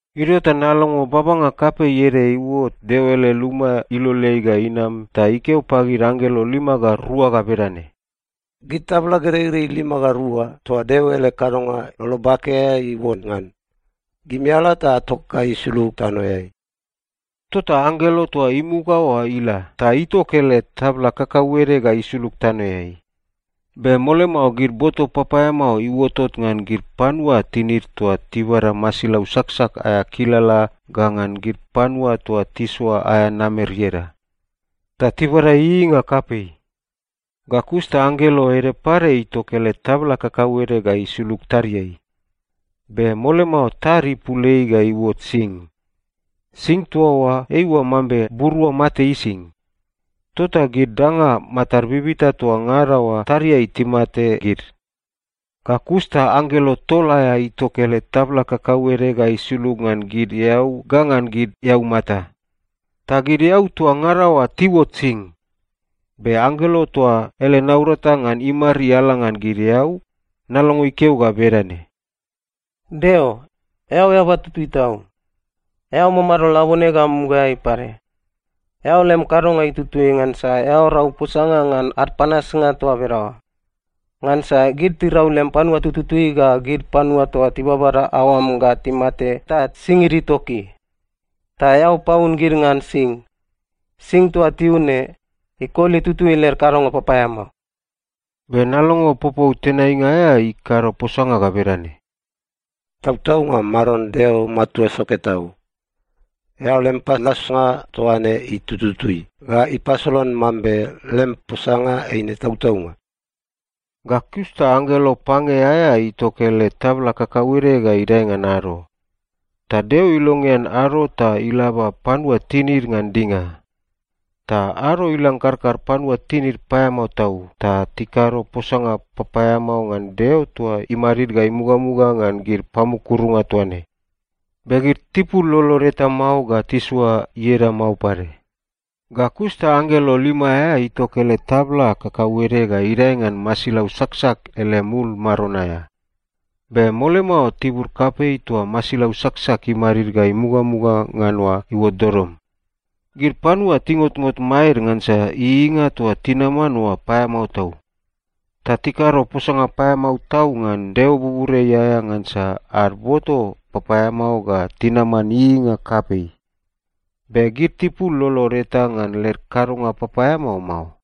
Idio ta nalongo babanga kapei ede iuot Deo ele luma iloleai ga inam ta ikeo pagid anggelo lima ga rua ga bedane, “Gid tabla gereirei lima ga rua toa Deo ele kadonga lolo bake aea iuon ngan, gimi ala ta atok ga isulug tanoeai.” Tota anggelo toa imuga oa ila ta itok ele tabla kakauede ga isulug tanoeai. Be mole mao gid boto papaeamao iuotot ngan gid panua tinid toa tibada masilau saksak aea kilala ga ngan gid panua toa tisoa aea namer ieda. Ta tibada ieieinga kapei. Ga kus ta anggelo ede pade itok ele tabla kakauede ga isulug tadiai. Be mole mao tad ipul ei ga iuot sing. Sing toa oa eiua mambe burua mate ising. Tota gid danga matad bibita toa ngada oa tadiai timate gid. Ga kus ta anggelo tol aea itok ele tabla kakauede ga isulug ngan gid eau ga ngan gid eaumata. Ta gid eau toa ngada oa tiuot sing. Be anggelo toa ele naurata ngan imariala ngan gid eau, nalongo ikeo ga bedane, “Deo, eao eaba tutui tau. Eao mamado labone ga mugaeai pade. Eao lem kadonga itutui ngansa eao rau posanga ngan ad panasnga toa bedaoa. Ngansa gid tirau lem panua tututui ga gid panua toa tibabada aoam ga timate ta singid itoki. Ta eao paun gid ngan sing. Sing toa tiun ne, ikoli tutui led kadonga papaeamao.” Be nalongo popou tenainga aea ikado posanga ga bedane, “Tautaunga, Maron Deo Matua Soke Tau! Eao lem panasnga toa ne itutui ga ipasolan mambe lem posanga eine tautaunga.” Ga kus ta anggelo pange aea itok ele tabla kakauede ga idae ngan ado. Ta Deo ilongean ado ta ilaba panua tinid ngan dinga. Ta ado ilang karkar panua tinid paeamao tau, ta tikado posanga papaeamao ngan Deo toa imadid ga imugamuga ngan gid pamukurunga toa ne. Be gid tipul lolod eta mao ga tisoa ieda mao pade. Ga kus ta anggelo lima aea itok ele tabla kakauede ga idae ngan masilau saksak ele mul maron aea. Be mole mao tibur kapei toa masilau saksak imadid ga imugamuga ngan oa iuot dodom. Gid panua tingotngot maed ngansa ieieinga toa tinaman oa paeamao tau. Ta tikado posanga paeamao tau ngan Deo buburiai aea ngansa ad boto papaeamao ga tinaman ieieinga kapei. Be gid tipul lolod eta ngan led kadonga papaeamao mao.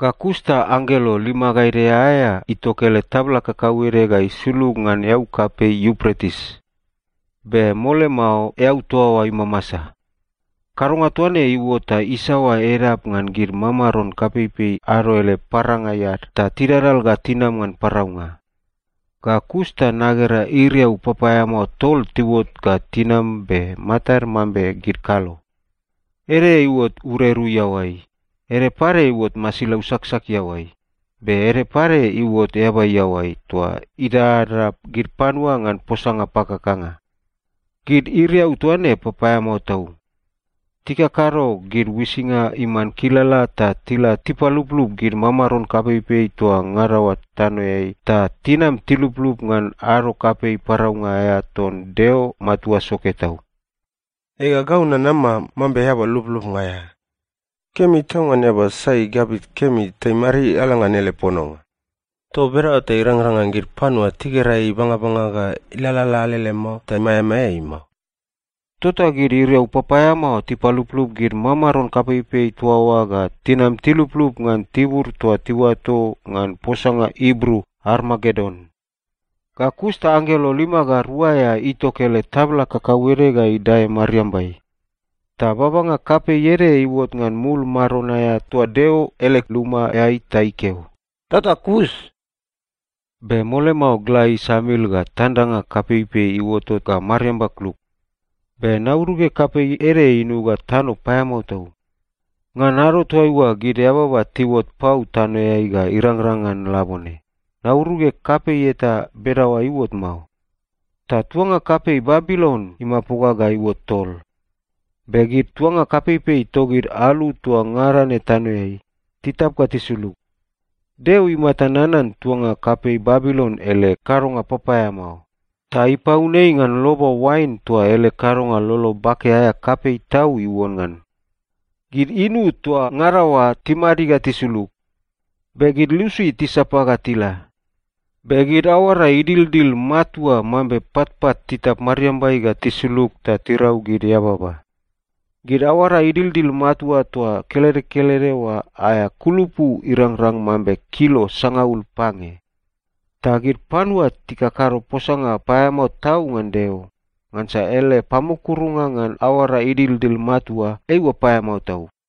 Ga kus ta anggelo lima ga ede aea itok ele tabla kakauede ga isulug ngan eau kapei Iupretis. Be mole mao eau toa oa imamasa. Kadonga toa ne iuot ta isaoa edap ngan gid mamaron kapeipei ado ele parangai ad ta tidadal ga tinam ngan paraunga. Ga kus ta nagera iriau papaeamao tol tiuot ga tinam be matad mambe gid kalo. Ede iuot ureru iaoai, ede pade iuot masilau saksak iaoai, be ede pade iuot eaba iaoai toa idadada gid panua ngan posanga pakakanga. Gid iriau toa ne papaeamao tau. Tikakado gid uisinga iman kilala ta tila tipaluplup gid mamaron kapeipei toa ngada oa tanoeai ta tinam tiluplup ngan ado kapei paraunga aea ton Deo Matua Soke Tau. “Ega, gau nanama mambe eaba lublubnga aea! Kemi tau ngan eaba sai igabit kemi ta imariala ngan ele pononga. Toa bedaoa ta irangrang ngan gid panua tigera ei ibangabanga ga ilalala alele mao ta maeamaea ei mao.” Tota gid iriau papaeamao tipaluplup gid mamaron kapeipei toa oa ga tinam tiluplup ngan tibur toa tiuato ngan posanga Ibru Armagedon. Ga kus ta anggelo lima ga rua aea itok ele tabla kakauede ga idae mariambai. Ta babanga kapei ede iuot ngan mul maron aea toa Deo ele lumaeai ta ikeo, “Tota kus!” Be mole mao gla isamil ga tandanga kapeipei iuotot ga mariamba kluk. Be nauruge kapei ede inuga tano paeamao tau. Ngan ado toaiua gid eababa tiuot pau tanoeai ga irangrang ngan labone, nauruge kapei eta bedaoa iuot mao. Ta tuanga kapei Babilon imapoga ga iuot tol. Be gid tuanga kapeipei togid alu toa ngada ne tanoeai, titap ga tisulug. Deo imata nanan tuanga kapei Babilon ele kadonga papaeamao, ta ipaun ei ngan loba oain toa ele kadonga lolo bake aea kapei tau iuon ngan. Gid inu toa ngada oa timadi ga tisulug. Be gid lusi tisapa ga tila. Be gid aoara idildil matua mambe patpat titap mariambai ga tisulug ta tirau gid eababa. Gid aoara idildil matua toa kelede kelede oa aea kulupu irangrang mambe kilo sangaul pange. Ta gid panua tikakado posanga paeamao tau ngan Deo, ngansa ele pamukurunga ngan aoara idildil matua eiua paeamao tau.